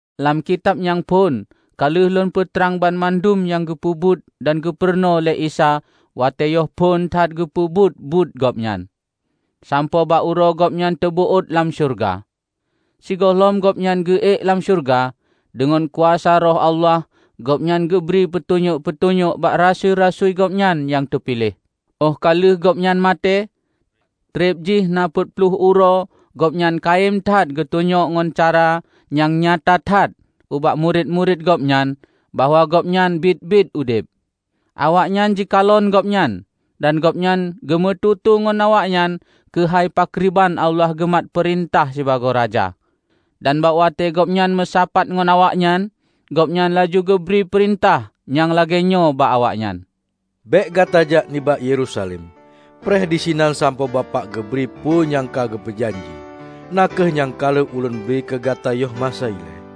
Lam kitab nyang phon ka lheueh lôn peutrang banmandum nyang geupeubuet dan geupurunoe lé Isa watée yoh phon that geupeuphon buet Gobnyan, sampoe bak uroe Gobnyan teubeuôt lam syeuruga. Sigohlom Gobnyan geu-ék lam syeuruga, deungon kuasa Roh Allah Gobnyan geubri peutunyok-peutunyok bak Rasui-rasui Gobnyan nyang teupiléh. Óh ka lheueh Gobnyan maté, treb jih na peuet ploh uroe Gobnyan kayém that geutunyok ngon cara nyang nyata that ubak murit-murit Gobnyan bahwa Gobnyan biet-biet udeb. Awaknyan jikalon Gobnyan, dan Gobnyan geumeututoe ngon awaknyan keuhai pakriban Allah geumat peurintah sibagoe Raja. Dan bak watée Gobnyan meusapat ngon awaknyan, Gobnyan laju geubri peurintah nyang lagée nyoe bak awaknyan, "Bék gata jak nibak Yerusalem. Preh disinan sampoe Bapak geubri peue nyang ka geupeu janji, na kheueh nyang ka lheueh Ulôn bri keu gata yoh masa ilée.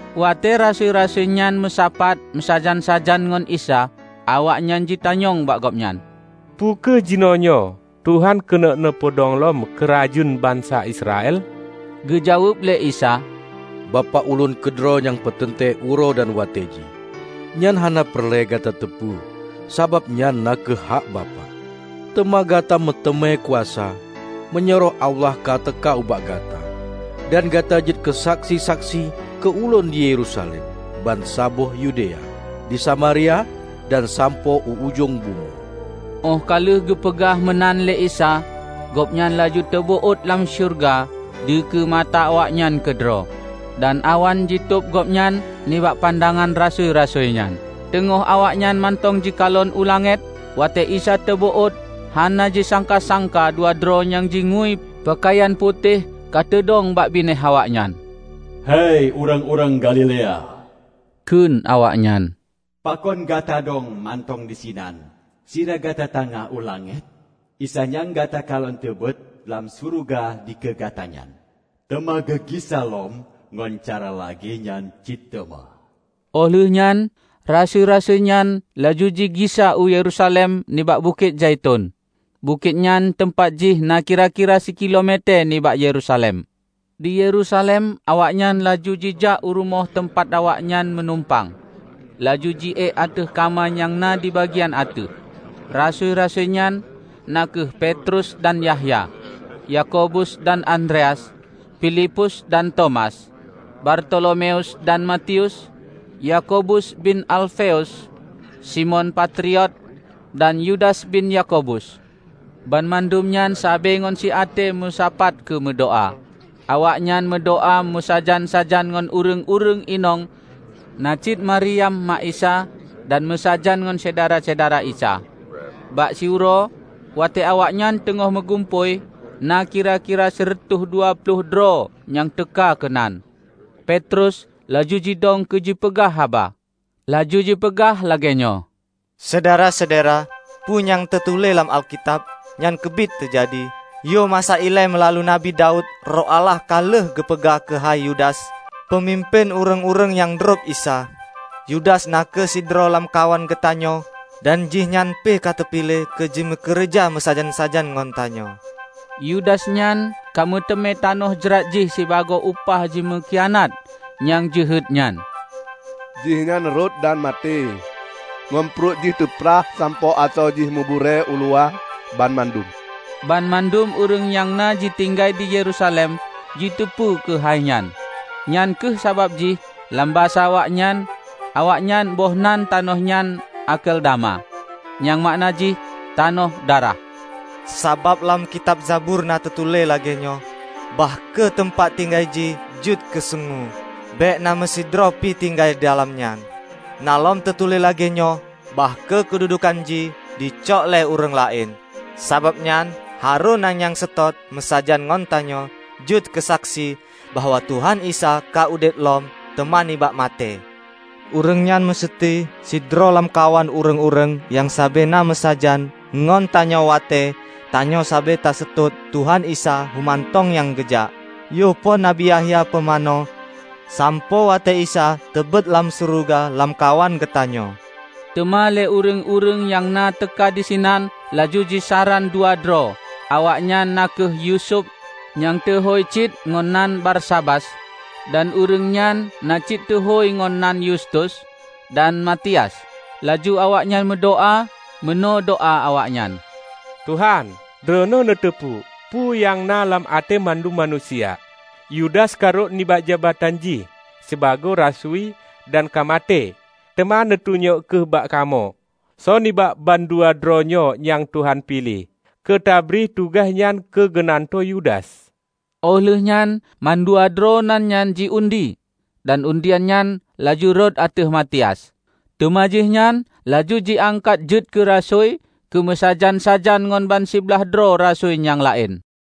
Watée Rasui-rasui nyan meusapat meusajan-sajan ngon Isa, awaknyan jitanyong bak Gobnyan, "Peu kheueh jinoenyoe Tuhan keuneuk neupeudong lom Keurajeuen bansa Israel?" Geujaweueb lé Isa, "Bapak Ulôn keudroe nyang peuteuntée uroe dan watée jih. Nyan hana peureulée gata teupeue, sabab nyan na kheueh hak Bapak. Teuma gata meuteumé kuasa, meunyoe Roh Allah ka teuka ubak gata. Dan gata jeuet keu saksi-saksi keu Ulôn di Yerusalem, bansaboh Yudea, di Samaria dan sampoe u ujong bumoe." Óh ka lheueh geupeugah meunan lé Isa, Gobnyan laju teubeuôt lam syeuruga dikeue mata awaknyan keudroe, dan awan jitôb Gobnyan nibak pandangan rasui-rasui nyan. Teungoh awaknyan mantong jikalon u langét, watée Isa teubeuôt, hana jisangka-sangka dua droe nyang jingui peukayan putéh ka teudong bak binéh awaknyan. "Hei ureuëng-ureuëng Galilea," kheun awaknyan, "Pakon gata dong mantong disinan sira gata tangah u langét? Isa nyang gata kalon teubeuôt lam syeuruga dikeue gata nyan, teuma geugisa lom ngon cara lagée nyan cit teuma." Óh lheuehnyan rasui-rasui nyan laju jigisa u Yerusalem nibak Bukét Zaiton. Bukét nyan teumpat jih na kira-kira sikilo metée nibak Yerusalem. Di Yerusalem awaknyan laju jijak u rumoh teumpat awaknyan meunumpang, laju ji-ék ateueh kama nyang na di bagian ateueh. Rasui-rasui nyan, na kheueh Petrus dan Yahya, Yakobus dan Andreas, Filipus dan Tomas, Bartolomeus dan Matius, Yakobus bin Alfeus, Simon Patriot dan Yudas bin Yakobus; banmandum nyan sabe ngon siaté meusapat keu meudoá. Awaknyan meudoá meusajan-sajan ngon ureuëng-ureuëng inong na cit Maryam mak Isa, dan meusajan ngon syedara-syedara Isa. Bak siuroe, watée awaknyan teungoh meugumpôi -- na kira-kira sireutôh dua ploh droe nyang teuka keunan -- Petrus laju jidong keu jipeugah haba. Laju jipeugah lagée nyoe, "Syedara-syedara! Peue nyang na teutuléh lam Alkitab, nyan keubiet teujadi. Yoh masa ilée meulalu Nabi Daud, Roh Allah ka lheueh geupeugah keuhai Yudas, peumimpén ureuëng-ureuëng nyang drob Isa. Yudas na kheueh sidroe lamkawan geutanyoe, dan jihnyan pih ka teupiléh keu jimeukeureuja meusajan-sajan ngon tanyoe." ( Yudas nyan ka meuteumé tanoh jrat jih sibagoe upah jimeukhianat nyang jeuhet nyan. Jihnyan rhot dan maté ngon pruet jih teuprah sampoe asoe jih meuburée uluwa banmandum. Banmandum ureuëng nyang na ji tinggai di Yerusalem jiteupeue keuhai nyan. Nyan kheueh sabab jih lam basa awaknyan, awaknyan boh nan tanoh nyan Akeldama, nyang makna jih 'Tanoh Darah'.) "Sabab lam kitab Zabur na teutuléh lagée nyoe, 'Bah kheueh teumpat tinggai jih jeuet keusungue; bék na meusidroe pih tinggai didalam nyan.' Na lom teutuléh lagée nyoe, 'Bah kheueh keududukan jih jicok lé ureuëng laén.' Sabab nyan, harôh na nyang seutôt meusajan ngon tanyoe jeuet keusaksi bahwa Tuhan Isa ka udeb lom teuma nibak maté. Ureuëng nyan museuti sidroe lamkawan ureuëng-ureuëng nyang sabe na meusajan ngon tanyoe watée tanyoe sabe taseutôt Tuhan Isa homantong nyang geujak, yoh phon Nabi Yahya peumanö sampoe watée Isa teubeuôt lam syeuruga lamkawan geutanyoe." Teuma lé ureuëng-ureuëng nyang na teuka disinan laju jisaran dua droe, awaknyan na kheueh Yusuf nyang teuhôi cit ngon nan Barsabas (dan ureuëng nyan na cit teuhôi ngon nan Yustus), dan Matias. Laju awaknyan meudoá. Meunoe doá awaknyan, "Tuhan, Droeneueh neuteupeue peue nyang na lam até mandum manusia. Yudas ka rhot nibak jabatan jih sibagoe rasui dan ka maté, teuma neutunyok kheueh bak kamoe, soe nibak bandua droe nyoe nyang Tuhan piléh keu teubri tugaih nyan keugeunantoe Yudas." Óh lheuehnyan mandua droe nan nyan ji-undi, dan undian nyan laju rhot ateueh Matias. Teuma jihnyan laju jiangkat jeuet keu rasui keu meusajan-sajan ngon bansiblaih droe rasui nyang laén.